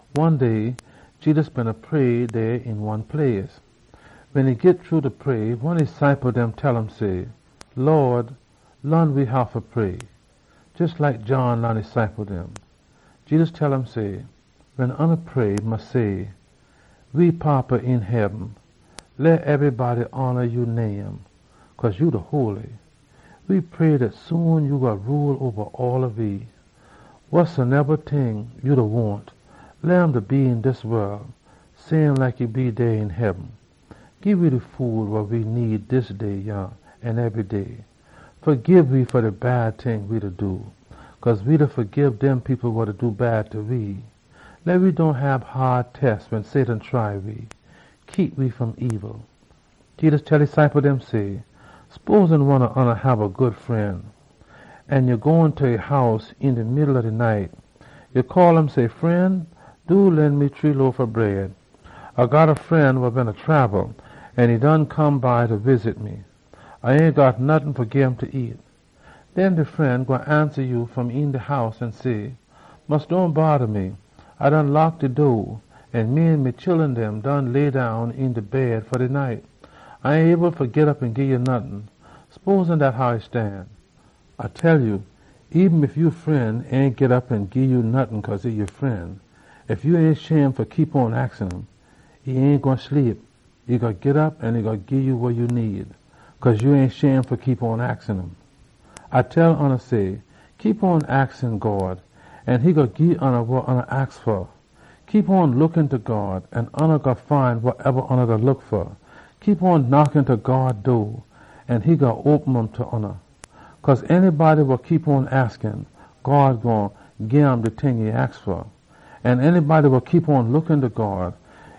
One day Jedus beena pray dey een one place. Wen e git shru da pray, one e ciple dem tell um say, “Lawd, laan we how fa pray, jes like John laan e ciple dem.” Jedus tell um say, “Wen oona pray, mus say, ‘We Fada [wa dey een heaben,] leh ebrybody hona ya name. We pray dat soon ya gwine rule oba de wol. [Wasoneba ting ya wahn, leh um be so een dis wol, same like dey een heaben.] Gii we de food wa we need dis day yah an ebry day. Fagib we fa we sin, cause we da fagib dem people wa do bad ta we. Leh we dohn hab haad test wen Satan try we. [Keep we fom ebil.]’” Jedus tell e ciple dem say, “Sposin one ob oona hab a good fren, an ya gone ta e house een de middle ob de night. Ya call um say, ‘Fren, do lend me shree loaf ob bread. A got a fren wa beena trabel an e done come by fa wisit me. A ain got nottin fa gim fa nyam.’ Den e gwine ansa ya fom een de house an say, ‘Mus dohn bodda me. A done lock de door, an me an me chullun done lay down een de bed fa de night. A ain able fa git op an gii ya nottin.’ Sposin dat how e stan? A da tell ya, eben ef ya fren ain git op an gii ya nottin cause e ya fren, ef ya ain shame fa keep on da aks um, e gwine git op an e gwine gii ya wa ya need, cause ya ain shame fa keep on da aks um. A da tell oona say, aks God an e gwine gii ya wa ya aks fa. Look ta God, an ya gwine find wasoneba ya da look fa. Knock ta God door, an e gwine open um ta ya. Cause de poson wa aks, God gwine gim wa e aks fa. De poson wa look ta God,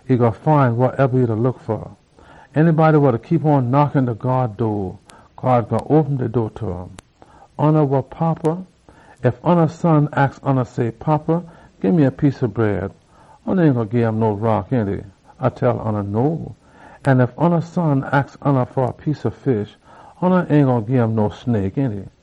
e gwine find wasoneba e da look fa. An de poson wa knock ta God door, God gwine open de door ta um. Oona wa fada, ef ya son aks ya say, ‘Fada, gii me a piece ob bread,’ ya ain gwine gim no rock, ainty? An ef ya son aks ya fa a piece ob fish, ya ain gwine gim no snake, ainty?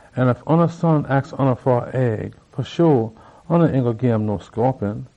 An ef ya son aks ya fa a egg, fa sho ya ain gwine gim no scorpion!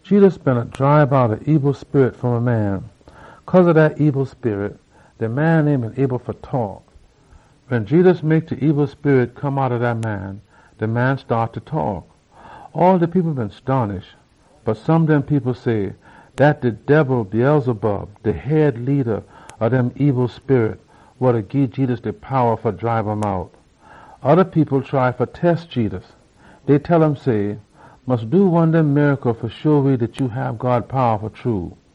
Jedus beena dribe out a ebil sperit fom a man. Cause ob dat sperit, de man ain been able fa taak. Wen Jedus mek de ebil sperit come outta dat man, de man staat fa taak. All de people been stonish. Bot some dem people say, “Dat de debil Beelzebub, de leada ob de ebil sperit dem, wa da gii Jedus de powa fa dribe um out.” Oda people try fa test Jedus. Dey tell um say, “Mus do one dem miracle fa sho we dat ya hab God powa fa true.”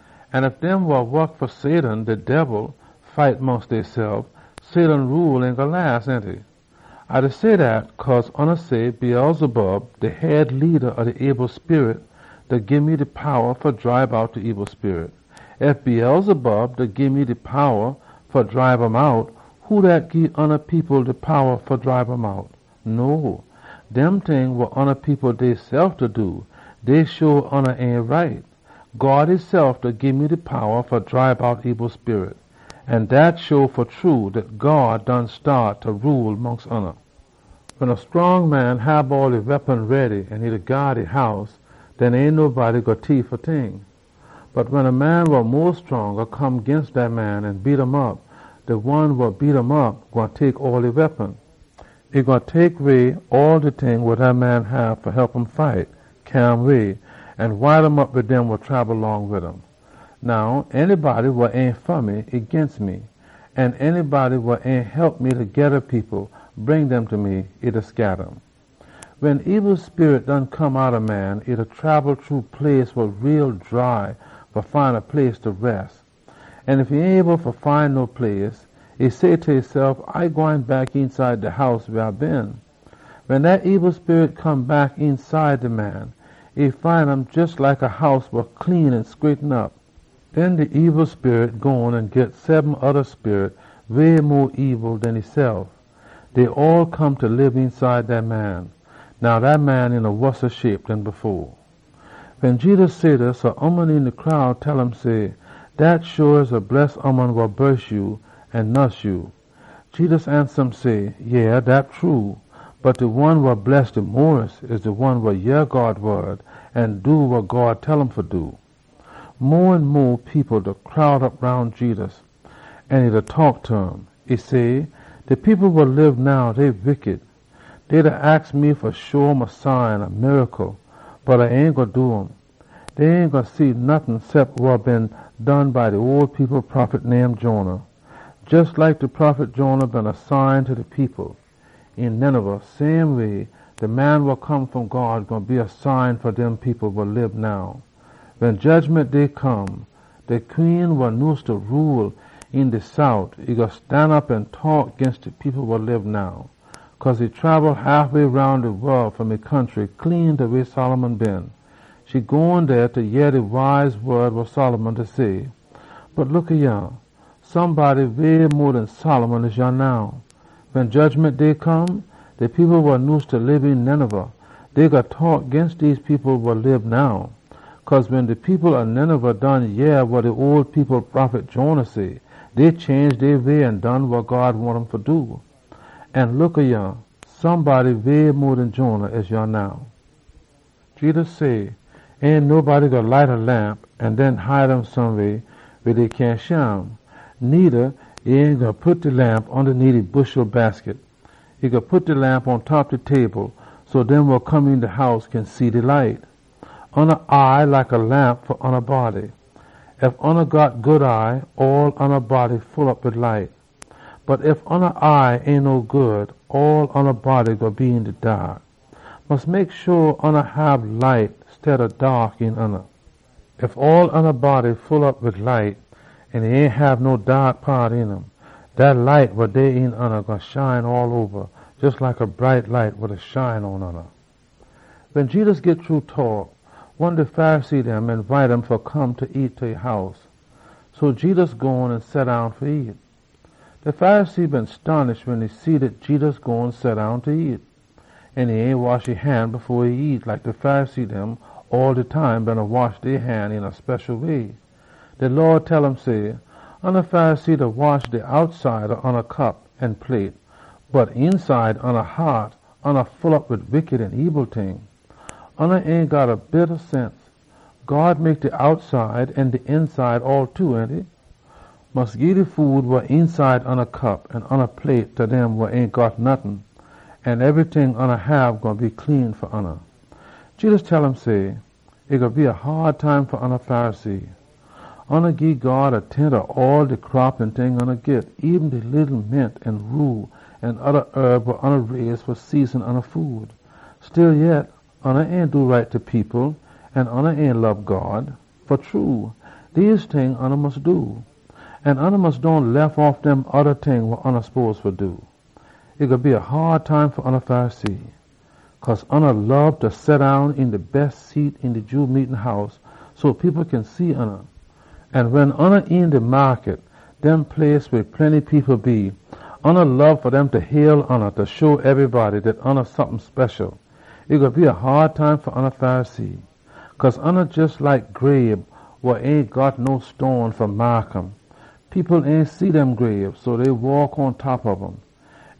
An ef dem wa wok fa Satan fight mongst deysef, Satan rule ain gwine las, ainty? A da say dat cause oona say, ‘Beelzebub, de head leada ob de ebil sperit dem, e da gii me de powa fa dribe out de ebil sperit.’ Ef Beelzebub da gii me de powa fa dribe ebil sperit, who dat gii oona people de powa fa dribe um out? No! Dem ting wa oona people deysef da do, dey show oona ain right. God esef da gii me de powa fa dribe out ebil sperit, an dat show fa true dat God done staat fa rule mongst oona. “Wen a scrong man hab all e weapon ready an e da gyaad e house, den ain nobody gwine tief e ting dem. Bot wen a man wa mo scronga come ginst dat man an beat um op, de one wa beat um op gwine tek all e weapon. E gwine tek way all de ting dem wa dat man hab fa hep um fight, cyaa um way, an wide um op wid dem wa trabel long wid um. “Now anybody wa ain fa me, e ginst me. An anybody wa ain hep me fa geda people, bring dem ta me, e da scatta um. “Wen ebil sperit done come outta a man, e da trabel shru dry place fa find a place fa res. Ef e ain able fa find no place, e say ta esef, ‘A gwine back eenside de house weh A been.’ Wen dat ebil sperit come back eenside de man, e find um jes like a house wa clean an scraighten op. Den de ebil sperit gone an git seben oda sperit way mo ebil den esef. Dey all come fa lib eenside dat man. Now dat man een a wossa shape den e been.” Wen Jedus say dis, a ooman een de crowd tell um say, “Dat sho a bless ooman wa bon ya an nuss ya!” Jedus ansa um say, “Yeh, dat true, bot de one wa bless fa true, e de one wa yeh God wod an do wa God tell um fa do!” Mo an mo people beena crowd op roun Jedus, an e taak ta um. E say, “De people wa lib now, dey wickity. Dey da aks me fa sho um a sign, bot A ain gwine do um. Dey ain gwine see no sign cep de sign ob de prophet Jonah. Jes like Jonah been a sign ta de people een Ninevah, same way so, de Man wa Come fom God gwine be a sign fa dem people wa da lib now. Wen Jedgiment Day come, de queen wa nyuse fa rule een de sout, e gwine stanop an taak ginst de people wa da lib now. Cause e been trabel haf way roun de wol fom e country clean ta weh Solomon been. E gone dey fa yeh de wise wod wa Solomon say. Bot look yah, somebody way mo den Solomon dey yah now. Wen Jedgiment Day come, de people wa nyuse fa lib een Ninevah, dey gwine taak ginst dem people wa da lib now. Cause wen de people ob Ninevah done yeh wa de ole people prophet Jonah say, dey change dey sinful way an ain do um no mo. An look yah, somebody way mo den Jonah dey yah now!” Jedus say, “Ain nobody gwine light a lamp an den hide um someweh weh dey cyahn shim. Needa e ain gwine pit de lamp ondaneet a bushel basket. E gwine pit de lamp pontop ob a table so dem wa come een de house kin see de light. Ya eye like a lamp fa ya body. Ef ya got good eye, all ya body full op wid light. Bot ef ya eye ain no good, all ya body gwine be een de daak. Mus mek sho ya hab light steada daak een ya. Ef all ya body full op wid light an e ain hab no daak paat een um, dat light wa dey een ya gwine shine all oba, jes like a bright lamp wa da shine pon ya.” Wen Jedus git shru da taak, one de Pharisee dem eenbite um fa come nyam ta e house. So Jedus gone an seddown fa nyam. De Pharisee been stonish wen e see dat Jedus done seddown fa nyam an e ain wash e han same way de Pharisee dem beena wash dey han. De Lawd tell um say, “Oona Pharisee da wash de outside ob oona cup an plate, bot eenside oona haat, oona full op wid wickity an ebil ting. Oona ain got a bit ob sense! God mek de outside an de eenside all two, ainty? Mus gii de food wa eenside oona cup an oona plate ta dem wa ain got nottin, an ebryting oona hab gwine be clean fa oona.” Jedus tell um say, “E gwine be a haad time fa oona Pharisee! Oona gii God a tent ob all de crop an ting oona git, eben de leetle mint an rue an oda herb wa oona raise fa season oona food. Stillyet, oona ain do right ta people, an oona ain lob God. Fa true, dese ting oona mus do. An oona mus dohn lef off dem oda ting wa oona spose fa do. “E gwine be a haad time fa oona Pharisee! Cause oona lob fa seddown een de bes seat een de Jew meetin house so people kin see oona. An wen oona een de maakut, oona lob fa dem fa hail oona fa sho ebrybody dat oona sompin special. E gwine be a haad time fa oona Pharisee! Cause oona jes like grabe wa ain got no stone fa maak um. People ain see dem grabe, so dey waak pontop ob um.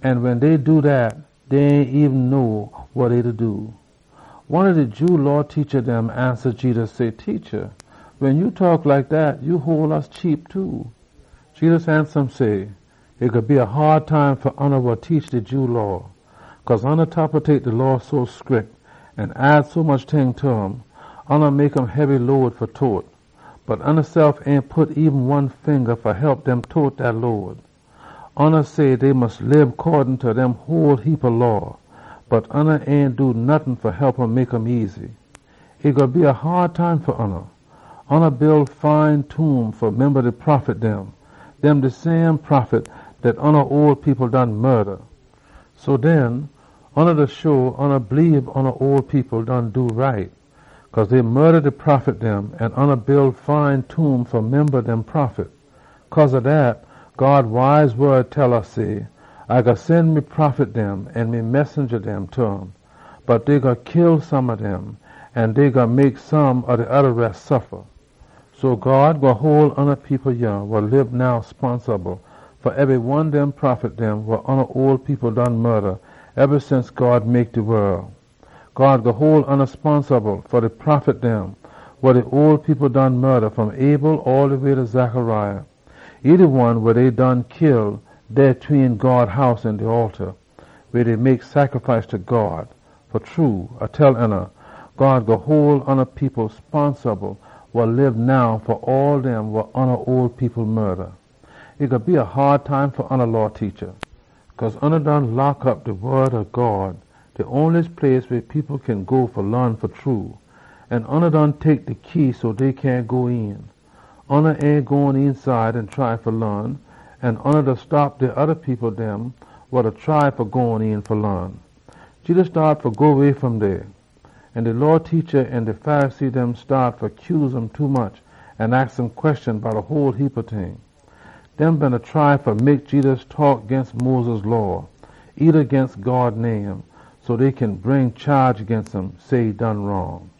An wen dey do dat, dey ain eben know wa dey da do.” One ob de Jew Law teacha dem ansa Jedus say, “Teacha, wen ya da taak like dat, ya hole we cheap too.” Jedus ansa um say, “E gwine be a haad time fa oona wa teach de Jew Law! Cause oona da tapetate de Law so scrick an add sommuch ting ta um, oona mek um hebby load fa tote. Bot oonasef ain pit eben one finga fa hep dem tote dat load. Oona say dey mus lib coddin ta dem whole heapa law, bot oona ain do nottin fa hep mek um easy. E gwine be a haad time fa oona! Oona build fine tomb fa memba de prophet dem. Dem de same prophet dat oona ole people done kill. So den, oona da show oona bleebe oona ole people done do right. Cause dey kill de prophet dem an oona build fine tomb fa memba dem prophet. Cause ob dat, God wise wod tell we say, ‘A gwine sen me prophet dem an me messenja dem ta um. Bot dey gwine kill some ob dem, an dey gwine mek some de oda res suffa.’ So God gwine hole oona people yah wa lib now sponsable fa ebry one ob dem prophet wa oona ole people done kill eba since God mek de wol. God gwine hole oona sponsable fa de prophet dem wa de ole people done kill, fom Abel all de way ta Zechariah, wa dey done kill dey tween God House an de alta weh dey mek sacrifice ta God. Fa true, A da tell oona, God gwine hole oona people sponsable wa lib now fa all dem wa oona ole people kill! “E gwine be a haad time fa oona Law teacha! Cause oona done lock op de wod ob God, de onliest place weh people kin go fa laan fa true. An oona done tek de key so dey cyahn go een. Oona ain gone eenside an try fa laan, an oona da stop de oda people dem wa da try fa gone een fa laan!” Jedus staat fa go way fom dey, an de Law teacha an de Pharisee dem staat fa cuse um tommuch an aks um queshon bout a whole heapa ting. Dey beena try fa mek Jedus taak ginst Moses Law, eeda ginst God name, so dey kin bring chaage ginst um, say e done wrong.